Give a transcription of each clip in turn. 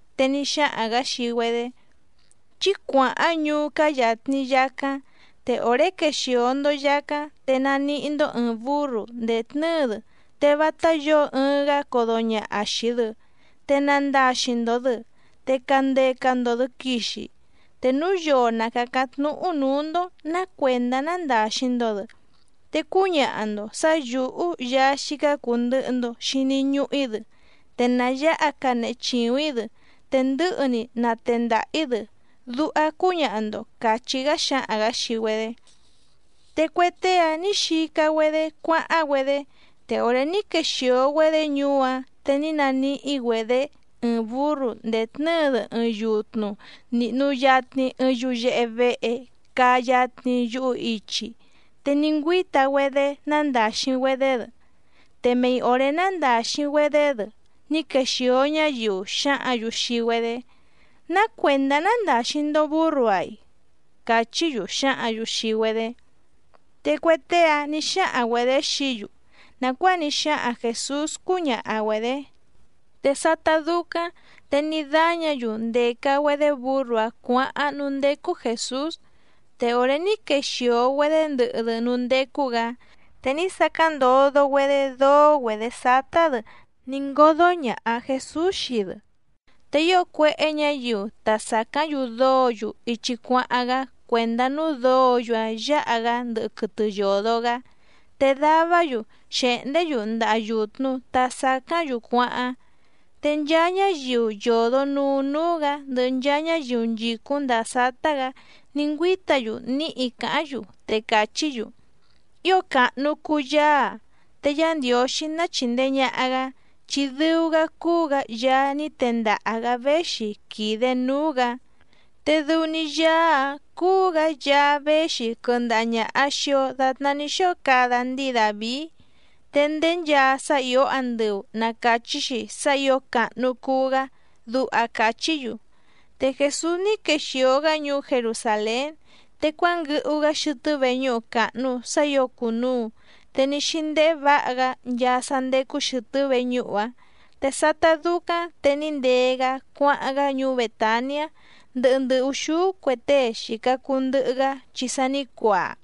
Te ní xáhaⁿ‑gǎ xii‑güedé: —Chí cuàháⁿ ñuú cáá yàtni yacáⁿ, te òré quexìo‑ndo yacáⁿ te naníhí‑ndó ɨ̀ɨⁿ búrru ndètnɨ́ɨ‑dɨ, te vátá yǒo ɨɨⁿ‑gá codo ñàha xii‑dɨ, te nandaxi‑ndo‑dɨ te candeca‑ndo‑dɨ quìxi. Te núu yoo na càcáⁿ tnúhú nǔú‑ndó nǎ cuèndá nándàxi‑ndo‑dɨ, te cúñaha‑ndo sǎ yǔhú Yaá xícá cùu ndɨhɨ‑ndo xini ñuhu‑í‑dɨ, te na yǎha canehe chìuⁿ‑í‑dɨ te ndɨ̌hɨ‑ni natendaha‑ǐ‑dɨ, duha cúñaha‑ndo —càchí‑gá xǎhaⁿ‑gǎ xii‑güedé. Te cue tée‑áⁿ nǐ xica‑güedé cuáháⁿ‑güedé, te òré ní quexìo‑güedé ñuú‑áⁿ te ní naníhí‑güedě ɨɨⁿ bǔrru ndètnɨ́ɨ‑dɨ ɨɨⁿ yutnu nìhnu yatni ɨɨⁿ yuyehe vehe caa yatni yuhu ichi, te ní ngüíta‑güedé nándàxi‑güedé‑dɨ. Te mei òré nándàxi‑güedé‑dɨ ní quexìo ñáyiu xǎhǎⁿ‑yu xii‑güedé: —¿Ná cuèndá nándàxi‑ndo búrru‑áⁿ‑i? —càchí‑yu xǎhǎⁿ‑yu xii‑güedé. Te cue tée‑áⁿ nǐ xáhaⁿ‑güedě xií‑yu nàcuáa ní xáhaⁿ Jèsús cúñaha‑güedě. Te sátá dúcáⁿ te ní dáñǎ‑yu ndèca‑güedé bǔrru‑áⁿ cuǎháⁿ núú ndécú Jèsús. Te òré ní quexìo‑güedé ndɨhɨ‑dɨ núú ndécú‑gǎ, te ní sacáⁿ ndodo‑güedé dóó‑güedě sátá‑dɨ, ní ngódó ñàha Jesús xii‑dɨ. Te ío cuéhé ñǎyiu ta sàcáⁿ‑yu dóǒ‑yu ichi cuáháⁿ‑gá cuèndá núú dǒǒ‑yu‑áⁿ yǎha‑gá ndɨhɨ quɨtɨ yòdo‑gá, te davá‑yu xèhndé‑yu ndaha yùtnu ta sacáⁿ‑yu cuáháⁿ. Te nchaa ñáyiu yòdo nuu núú‑gǎ ndɨhɨ nchaa ñáyiu nchìcúⁿ ndàa sátá‑gǎ ní ngüíta‑yu níhi càháⁿ‑yu, te càchí‑yu: —¡Ío càhnu cuu Yaá‑a! ¡Te Yá Ndiǒxí ná chìndee ñaha‑gá, chi dɨu‑gá cúú‑gǎ Yaá ní tendaha‑gǎ véxi quìde núú‑gǎ! ¡Te dɨu‑ni Yaá‑á cúú‑gǎ Yaá véxi quɨndaha ñàha xii‑o datná ní xóo cada ndíi Dàvií! ¡Te ndéé nchaa sá ìó andɨu na càchí‑xi sá ǐo càhnu cuu‑gá! —duha càchí‑yu. Te Jèsús ní quexìo‑gá ñuú Jerusàlén, te cuánguɨhu‑gá xɨtɨ́ veñúhu càhnu sá ǐo cùnuu, te ní xíndéhé vǎha‑gá nchaa sá ndécú xɨ̀tɨ́ veñúhu‑áⁿ. Te sátá dúcáⁿ te ní ndee‑gá cuáháⁿ‑gá ñuú Bètaniá ndɨhɨ ndɨ ùxúú cue tée xìca cuu ndɨhɨ‑gá chi sa ní cuaa.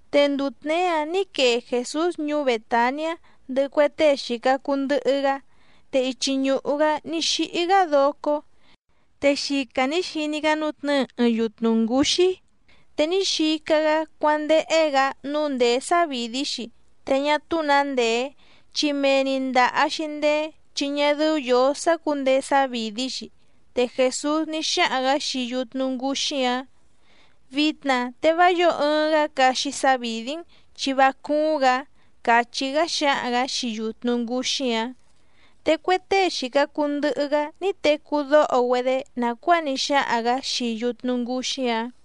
Te nduu tněé‑áⁿ nǐ quee Jèsús ñuú Bètaniá ndɨhɨ cue tée xìca cuu ndɨhɨ‑gá, te ichi ñùhu‑gá ní xíhí‑gá docó. Te xica nǐ xiní‑gá nútnɨ̌ɨ ɨɨⁿ yutnu ngǔxí, te ní xica‑gá cuándéhé‑gǎ nǔu ndèé sávìdí‑xi te ñá túú nǎ ndèé, chi mee‑ni ndàha‑xi ndeé chi ñá dɨ́ú yǒó sácǔndeé sávìdí‑xi. Te Jèsús ní xáhaⁿ‑gǎ xii yutnu ngǔxí‑áⁿ: —Vitna te vá yǒo ɨɨⁿ‑gá caxi sávìdí‑n, chi vá cúúⁿ‑gǎ —càchí‑gá xǎhaⁿ‑gǎ xii yutnu ngǔxí‑áⁿ. Te cue tée xìca cuu ndɨhɨ‑gá ní tecú dóho‑güedé nàcuáa ní xáhaⁿ‑gǎ xii yutnu ngǔxí‑áⁿ.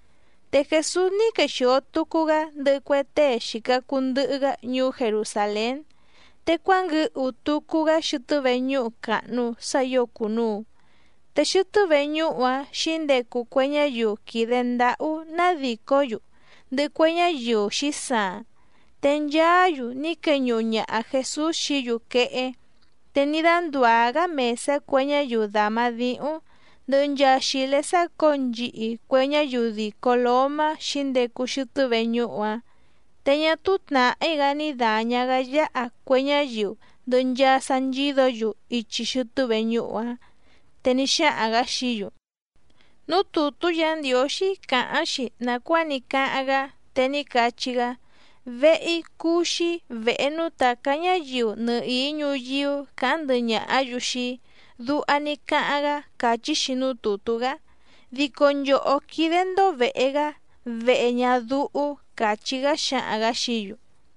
Te Jèsús ní quexìo tucu‑gá ndɨhɨ cue tée xìca cuu ndɨhɨ‑gá ñuú Jerusàlén, te cuánguɨhu tucu‑gá xɨtɨ́ veñúhu càhnu sá ǐo cùnuu, te xɨtɨ́ veñúhu‑áⁿ xǐndecu cue ñáyiu quìde ndáhú nádìcó‑yu, ndɨhɨ cue ñáyiu xǐsaaⁿ. Te nchaá‑yu ní queñuhu ñaha Jèsús xií‑yu quehé, te ní dándùá‑gá mèsá cue ñáyiu dàma díhúⁿ, ndɨhɨ nchaa xìlé sácǒo nchihi cue ñáyiu dìco lómá xǐndecu xɨtɨ́ veñúhu‑áⁿ. Te ñá túú tnàhí‑gá ní dàña‑gá yáha cue ñáyiu ndɨhɨ nchaa sá nchídǒ‑yu ichi xɨtɨ́ veñúhu‑áⁿ. Te ní xáhaⁿ‑gǎ xií‑yu: —Núú tùtú Yǎ Ndiǒxí càháⁿ‑xi nàcuáa ní cáháⁿ‑gá, te ní cachí‑gá: “Vehe‑í cúú‑xí vèhe núú tàcá ñáyiu nɨhìí ñuyíú càháⁿ ndɨhɨ ñàhá‑yu xii‑í”, duha ní cáháⁿ‑gá càchí‑xi núú tùtú‑gá. Dico nchòhó quídé‑ndó vèhe‑gá vehe ñadúhú —càchí‑gá xǎhaⁿ‑gǎ xií‑yu.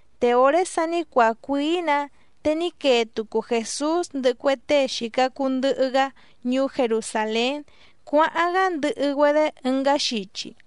Te òré sa ní cuaa cuìí‑nǎ, te ní quee tucu Jèsús ndɨhɨ cue tée xìca cuu ndɨhɨ‑gá ñuú Jerusàlén cuáháⁿ‑gá ndɨhɨ‑güedé ɨngá xichi.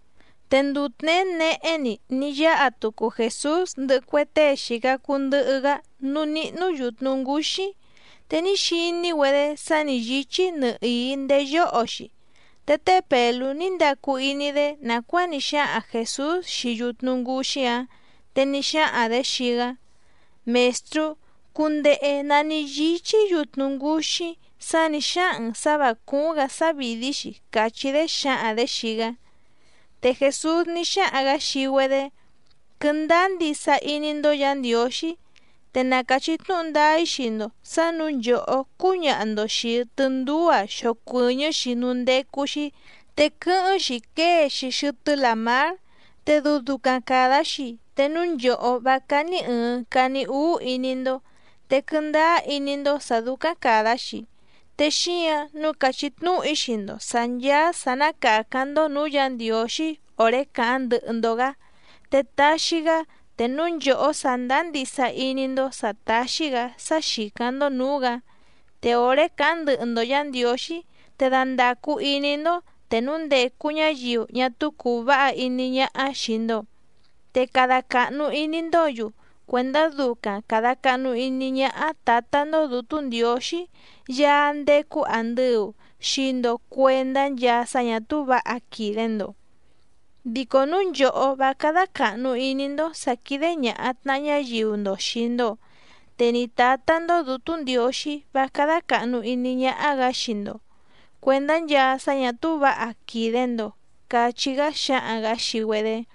Te nduu tněé nehé‑ni ní yáha tucu Jèsús ndɨhɨ cue tée xìca cuu ndɨhɨ‑gá núú níhnú yùtnu ngúxí, te ní xiní‑güedé sa ní yíchí nɨhìí ndéé yóho‑xi. Te té Pèlú ní ndacu iní‑dé nàcuáa ní xáhaⁿ Jèsús xii yutnu ngǔxí‑áⁿ, te ní xáhaⁿ‑dě xii‑gá: —Mèstrú, cundehe nǎ ní yíchí yutnu ngǔxí sá nǐ xáhaⁿ‑n sǎ vǎ cúúⁿ‑gǎ sávìdí‑xi —càchí‑dé xǎhaⁿ‑dě xii‑gá. Te Jèsús ní xáhaⁿ‑gǎ xii‑güedé: —Quɨndáá ndisa iní‑ndó Yǎ Ndiǒxí. Te na càchí tnúhu ndáá‑í xii‑ndo sǎ nǔu nchòhó cúñaha‑ndo xìi tɨndúú‑a xocuɨ̀ñɨ́‑xi núú ndécú‑xí, te quɨ́hɨ́ⁿ‑xi quée‑xi xɨtɨ́ làmár. Te dɨu ducaⁿ càda‑xi te núu nchòhó vá cání ɨ̀ɨⁿ cani úú iní‑ndó, te quɨndáá iní‑ndó sǎ dúcáⁿ càda‑xi. Te xíǎⁿ nǔu càchí tnúhu‑í xii‑ndo sǎ nchàa sá ná càcáⁿ‑ndó nǔú Yǎ Ndiǒxí òré càháⁿ ndɨhɨ‑ndo‑gǎ, te taxi‑gá te núu nchòhó sàndáá ndisa iní‑ndó sǎ táxí‑gǎ sá xìcáⁿ‑ndó nǔú‑gǎ. Te òré càháⁿ ndɨhɨ‑ndo Yǎ Ndiǒxí te dandàcu iní‑ndó te núu ndècu ñáyiu ñá túú cùu váha iní ñáhá xìi‑ndo, te cada càhnu iní‑ndǒ‑yu cuèndá ducaⁿ càda cahnu iní ñáhá Tǎtá‑ndó Dǔtú Ndiǒxí Yaá ndécú àndɨu xii‑ndo cuendá nchaa sá ñà túú vǎha quìde‑ndo. Dico núu nchòhó vá cádá càhnu iní‑ndó sǎ quídé ñàha tnaha ñáyiu‑ndo xìi‑ndo, te ni Tǎtá‑ndó Dǔtú Ndiǒxí vá cádá càhnu iní ñáhá‑gǎ xii‑ndo cuèndá nchaa sá ñà túú vǎha quìde‑ndo —cachí‑gá xǎhaⁿ‑gǎ xii‑güedé.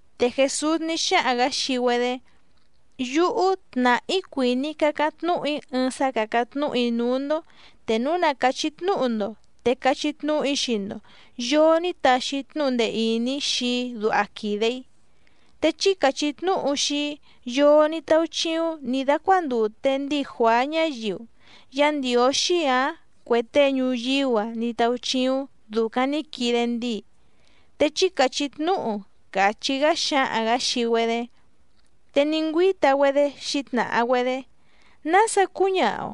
Te Jèsús ní xáhaⁿ‑gǎ xii‑güedé: —Yúhú tnàhá‑í cuìní‑í cácáⁿ tnúhu‑í ɨɨⁿ sá càcáⁿ tnúhu‑í núú‑ndó te núu na càchí tnúhu‑ndo, te cachí tnúhu‑í xii‑ndo yòo ní taxi tnúhu ndee ìní xii‑í duha quìde‑í. Te chí càchí tnúhu xii‑í yoo ní táúchíúⁿ nǐ dácuándùte ndíi Juàá ñáyiu, ¿Yá Ndiǒxí ǎⁿ cuè tée ñuyíú‑a ní táúchíúⁿ dùcaⁿ ní quide ndíi? Te chí càchí tnúhu —càchí‑gá xǎhaⁿ‑gǎ xii‑güedé. Te ní ngüíta‑güedé xǐtnàha‑güedé: —¿Nása cúñaha‑o?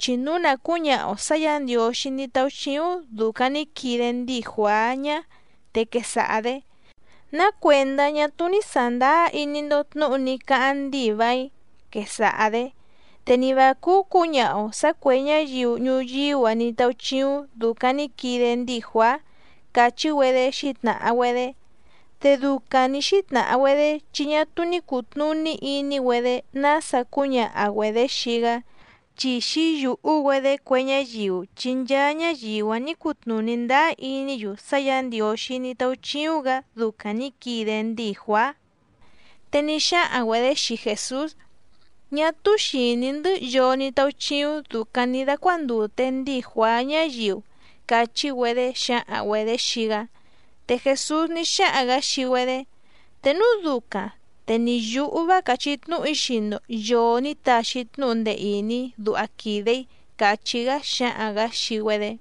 Chi núu na cǔñaha‑o sǎ Yǎ Ndiǒxí ní táúchíúⁿ dùcaⁿ ní quide ndíi Juàá ñá, te quesaha‑dě: “¿Ná cuèndá ñá túú ní sàndáá iní‑ndó tnǔhu ní cáháⁿ ndíi vàiⁿ?”, quesaha‑dě. Te ni vǎ cúú cǔñaha‑o sǎ cuè ñáyiu ñuyíú‑a ní táúchíúⁿ dùcaⁿ ní quide ndíi Juàá —càchí‑güedé xǐtnàha‑güedé. Te ducaⁿ nǐ xítnàha‑güedé chi ñá túú ní cùtnuní iní‑güedé nása cúñaha‑güedě xii‑gá, chi xǐyùhú‑güedé cue ñáyiu chi nchaa ñáyiu‑áⁿ nǐ cutnùní ndáá iní‑yu sá Yǎ Ndiǒxí ní táúchíúⁿ‑gǎ ducaⁿ nǐ quide ndíi Juàá. Te ní xáhaⁿ‑güedě xii Jèsús: —Ñá túú xìní‑ndɨ́ yoo ní táúchíúⁿ dùcaⁿ ní dácuándùte ndíi Juàá ñáyiu —càchí‑güedé xǎhaⁿ‑güedě xii‑gá. Te Jèsús ní xáhaⁿ‑gǎ xii‑güedé: —Te núu ducaⁿ te ni yǔhú vá càchí tnúhu‑í xii‑ndo yòo ní taxi tnúhu ndee ìní duha quìde‑í —càchí‑gá xǎhaⁿ‑gǎ xii‑güedé.